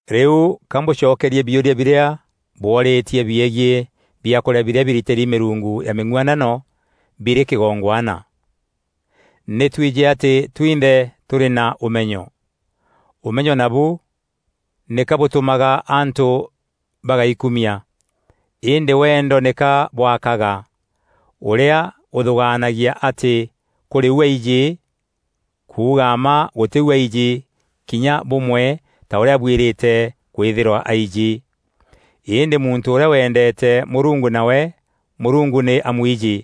Rîu ka mbûcokerie biûria birîa bwoorîîtie biegiî biakûrîa birîa biritîri mîrungu ya mîng'uanano birî kîgongwana. Nî twijî atî twinthe tûrî na ûmenyo. Ûmenyo nabu nîka bûtûmaga antû bagaikumia; îndî wendo nîka bwakaga. Ûrîa ûthûgaanagia atî kûrî u aijî, kuuga mma gûtî u aijî kinya bûmwe ta ûrîa abuîrîte kwîthîrwa aijî. Îndî muntû ûrîa wendeete Mûrungu nawe Mûrungu nî amwijî.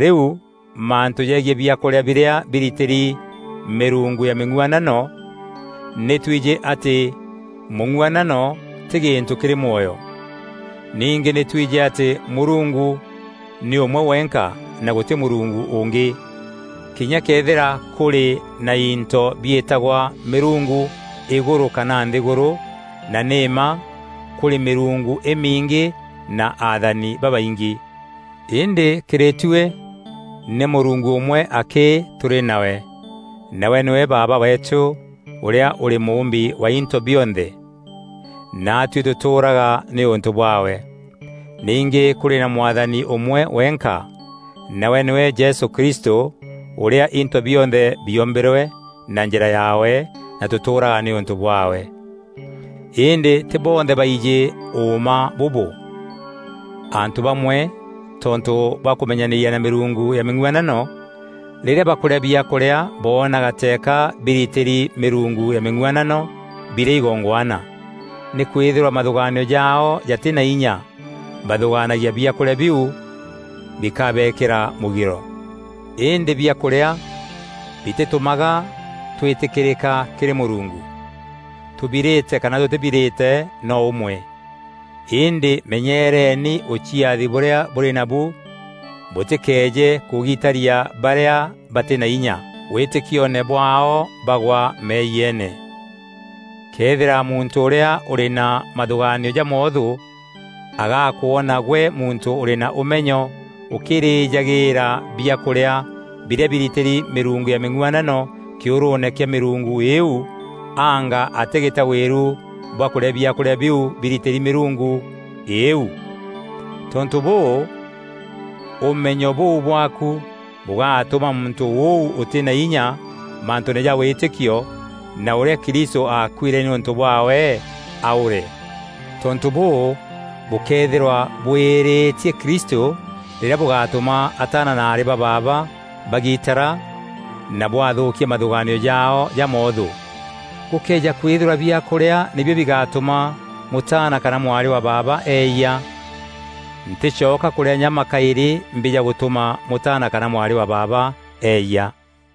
Rîu mantû jegiî biakûrîa birîa biritîri mîrungu ya mîng'uanano; nî twijî atî mûng'uanano tî gîntû kîrî mwoyo. Ningî nî twijî atî Mûrungu nî ûmwe wenka na gûtî Mûrungu ûngî. Kinya këethîra kûrî na into biîtagwa mîrungu îgûrû kana nthîgûrû, na nî mma kûrî mîrungu îmingî na athani babaingî, îndî kîrî tuî nî Mûrungu ûmwe akî tûrî nawe, nawe nîwe Baaba weetû ûrîa ûrî Mûûmbi wa into bionthe, naatuî tûtûûraga nîûntû bwaawe. Ningî kûrî na Mwathani ûmwe wenka, nawe nîwe Jesû Kristû, ûrîa into bionthe biombîrwe na njîra yaawe na tûtûûraga nîûntû bwaawe. Îndî tî bonthe baijî ûûma bûbû. Antû bamwe tontû bwa kûmenyanîria na mîrungu ya mîng'uanano rîrîa bakûrîa biakûrîa boonaga teeka biritîri mîrungu ya mîng'uanano birî igongwana. Nîkwîthîrwa mathûgaanio jaao jatî na inya, bathûgaanagia biakûrîa biu bikabeekîra mûgiro. Îndî biakûrîa bitîtûmaga twîtîkîrîka kîrî Mûrungu. Tûbirîte kana tûtîbirîte no ûmwe. Îndî menyeereeni ûciathi bûrîa bûrî nabu bûtîkeeje kûgiitaria barîa batî na inya wîtîkioone bwaao bagwa meeyiene. Këethîra muntû ûrîa ûrî na mathûgaanio jamoothû agakwona gwe muntû ûrî na ûmenyo ûkîrîjagîîra biakûrîa birîa biritîri mîrungu ya mîng'uanano kîûrûûne kîa mîrungu îîu, anga atîgîta wîru bwa kûrîa biakûrîa biu biritîri mîrungu îîu? Tontû bûû, ûmenyo bûu bwaaku bûgatûma muntû ûu ûtî na inya mantûûne ja wîtîkio na ûrîa Kristû aakuîre nîûntû bwaawe, aûre. Tontû bûû bûkethîra bûîîrîtie Kristû rîrîa bûgatûma ataana na aarî ba baaba bagitara na bwathûûkia mathûgaanio jaao jamoothû. Gûkëeja kwîthîrwa biakûrîa nîbio bigatûma mûtaana kana mwarî wa baaba eeyia, ntîcoka kûrîa nyama kaîrî mbîja gûtûma mûtaana kana mwarî wa baaba eeyia.